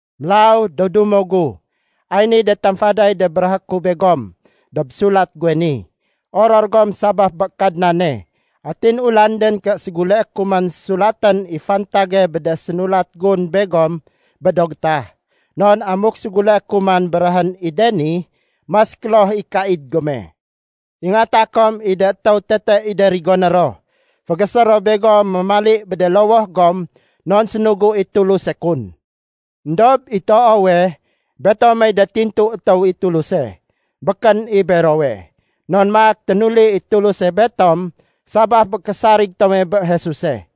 Mélaw, do dumo gu, ay niy de tamfaday de béréhé ku begom dob sulat guwe ni. Oror gom sabaf bé Kadnane! Atin ulanden ké séguleé ku man sulatén i fantage bé de sénulat gun begom bé do gétah. Non amuk séguleé ku man béréhén i de ni, mas kloh i kaid gome. Ingata kom i de étéw tete i de rigoné ro. Fégésé ro begom mémali bé de lowoh gom non sénugu i Tuluse kun. Endob i toowe, betomey de tintu étéw i Tuluse, békén i berowe. Non maak ténuli i Tuluse betom sabaf bé késarig tome bé Jesuse.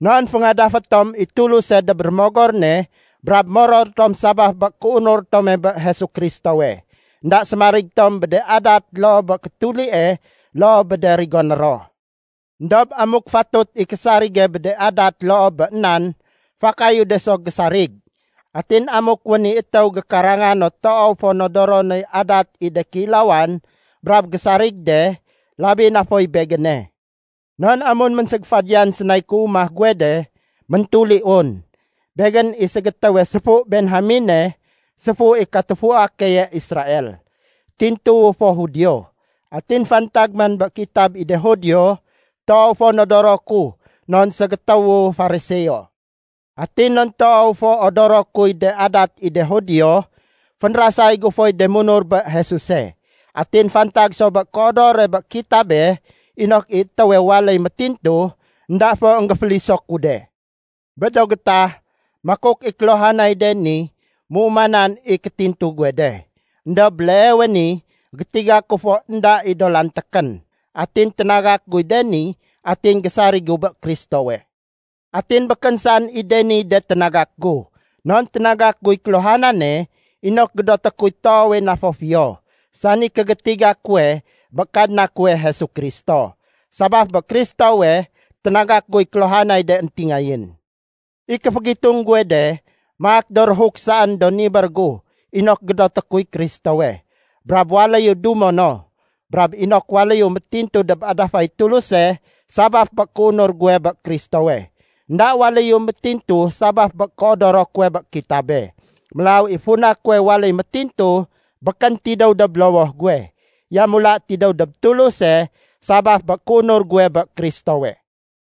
Non féngadafé tom i Tuluse dob Rémogor ne brab moror tom sabaf bé kéunur tome bé Jesu Kristowe. Enda sémarig tom bé de adat loo bé kétulie loo bé de rigoné ro. Endob amuk fatut i késarige bé de adat loo bé nan, fakayu de so gésarig. Atin amuk wén i étéw gékaranga no toow fo nodoro noy adat i de kéilawan brab gésarig de, labi na foy begéne. Non amun ménségéfadiyan sénay kéumah guwe de, méntuliun. Begén i ségétéwe séfu Benjamene, séfu i katufua keye Israel. Tintuwu fo Judio. Atin fantag man bé kitab i de Judio, toow fo nodoro ku non ségétéwu Fariseo. Atin non toow fo odoro kuy de adat i de Judio, fénrasay gu foy de munur bé Jesuse. Atin fantag so bé kéodore bé kitabe inok i étéwe waléy méntintu, énda fo énggéféliso ku de. Bé do gétah, makuk i kéluhanay de ni méumanan i kétintu guwe de. Endob béleewe ni gétiga ku fo énda i do lantékén. Atin ténagak guy de ni atin gésarigu bé Kristowe. Atin békén saén i de niy de ténagak gu, non ténagak guy kéluhanane inok gédoté kuy toowe na fo fiyo, sani kégétiga kuwe bé Kadna kuwe Jesu Kristo. Sabaf bé Kristowe ténagak guy kéluhanay de éntingayén. I kéfégitung guwe de, maak do réhuk saén do nibér gu inok gédoté kuy Kristowe, brab waléyu dumo no. Brab inok waléyu métintu dob adafay Tuluse sabaf bé kéunur guwe bé Kristowe. Enda waléyu métintu sabaf bé kéodoro kuwe bé kitabe. Mélaw i funa kuwe waléy métintu békén tidéw dob lowoh guwe, yamula tidéw dob Tuluse sabaf bé kéunur guwe bé Kristowe.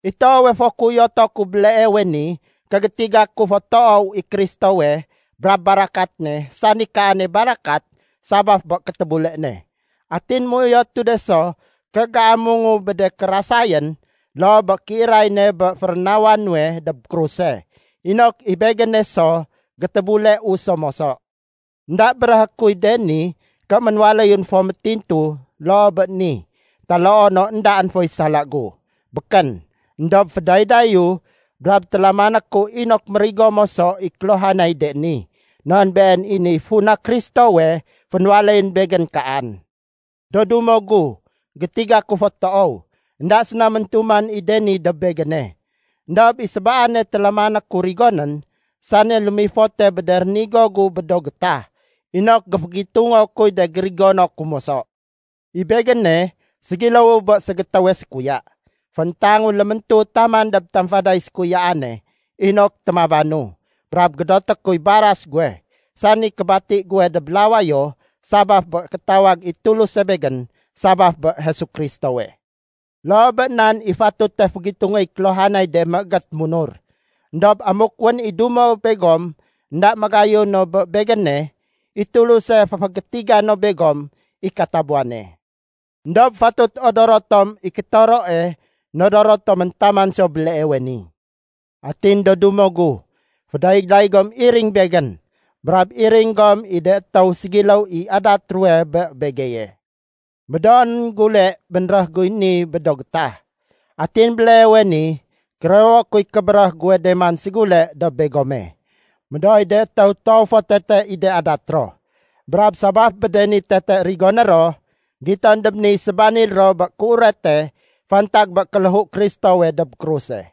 I toowe fo kéuyoto ku béleewe ni ké gétiga ku fo toow i Kristowe brab barakat ne sani Kaane barakat sabaf bé kétébule ne. Atin méuyotu de so ké géamungu bé de kérasayén loo bé kéiray ne bé férénawa nuwe dob kruse, inok i begéne so gétébuleu so moso. Enda béréhé kuy de ni ké ménwaléyun fo métintu loo bé ni taloo no éndaén foy sala gu. Békén! Endob fédaydayu brab télamané ku inok mérigo moso i kéluhanay de ni, non been i niy funa Kristowe fénwaléyén begén kaan. Do dumo gu, gétiga ku fo toow, énda séna méntuman i de ni dob begéne. Endob i sébaane télamané ku rigonén, sani lémifote bé de rénigo gu bé do gétah inok géfégitungo kuy de gérigono ku moso. I begéne ségiléwu bé ségétéwe sékuya. Fééntangu léméntu taman dob tamfaday sékuyaane inok témabanu brab gédoté kuy baras guwe, sani kébati guwe dob lawayo sabaf bé kétawag i Tuluse begén sabaf bé Jesu Kristowe. Loo bé nan i fatute fégitungéy kéluhanay de méégét munur. Endob amuk wén i dumo begom énda magayun no bé begéne, i Tuluse féfégétiga no begom i katabuwane. Endob fatut odoro tom i kétoroe nodoro tomén taman so béleewe ni. Atin do dumo gu, fédayday gom iring begén, brab iring gom i de étéw ségiléw i adat ruwe bé begeye. Médoonén gule bénréh guy ni bé do gétah. Atin béleewe ni kérewo kuy kébéréh guwe de man ségule dob begome. Médooy de étéw toow fo tete i de adat ro. Brab sabaf bé de ni tete rigoné ro, giton dob niy sébanil ro bé kéurete fantag bé kéléhu Kristowe dob kruse.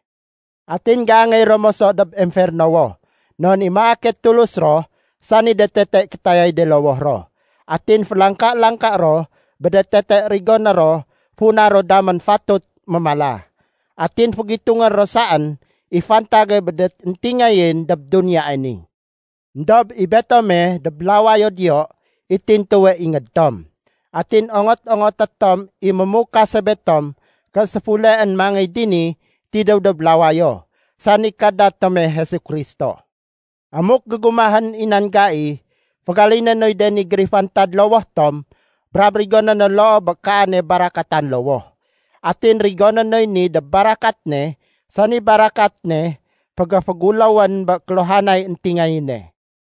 Atin géangéy ro moso dob emfernowo, non i maake tulus ro sani de tete kétayay de lowoh ro. Atin félangka-langka ro bé de tete rigoné ro funa ro damén fatut mémala. Atin fégitungé ro saén i fantage bé de éntingayén dob duniyae ni. Endob i betome, dob lawayo diyo i tintuwe ingéd tom. Atin ongot-ongoté tom i mémukase betom ké séfuleén mangéy dini tidéw dob lawayo, sani Kadna tome Jesu Kristo. Amuk gégumahén i nan gai, fégaliné noy de ni gérifantad lowoh tom brab rigoné no loo bé kaane barakatan lowoh. Atin rigoné noy ni dob barakat ne sani barakat ne fégéféguléwén bé kéluhanay éntingayéne.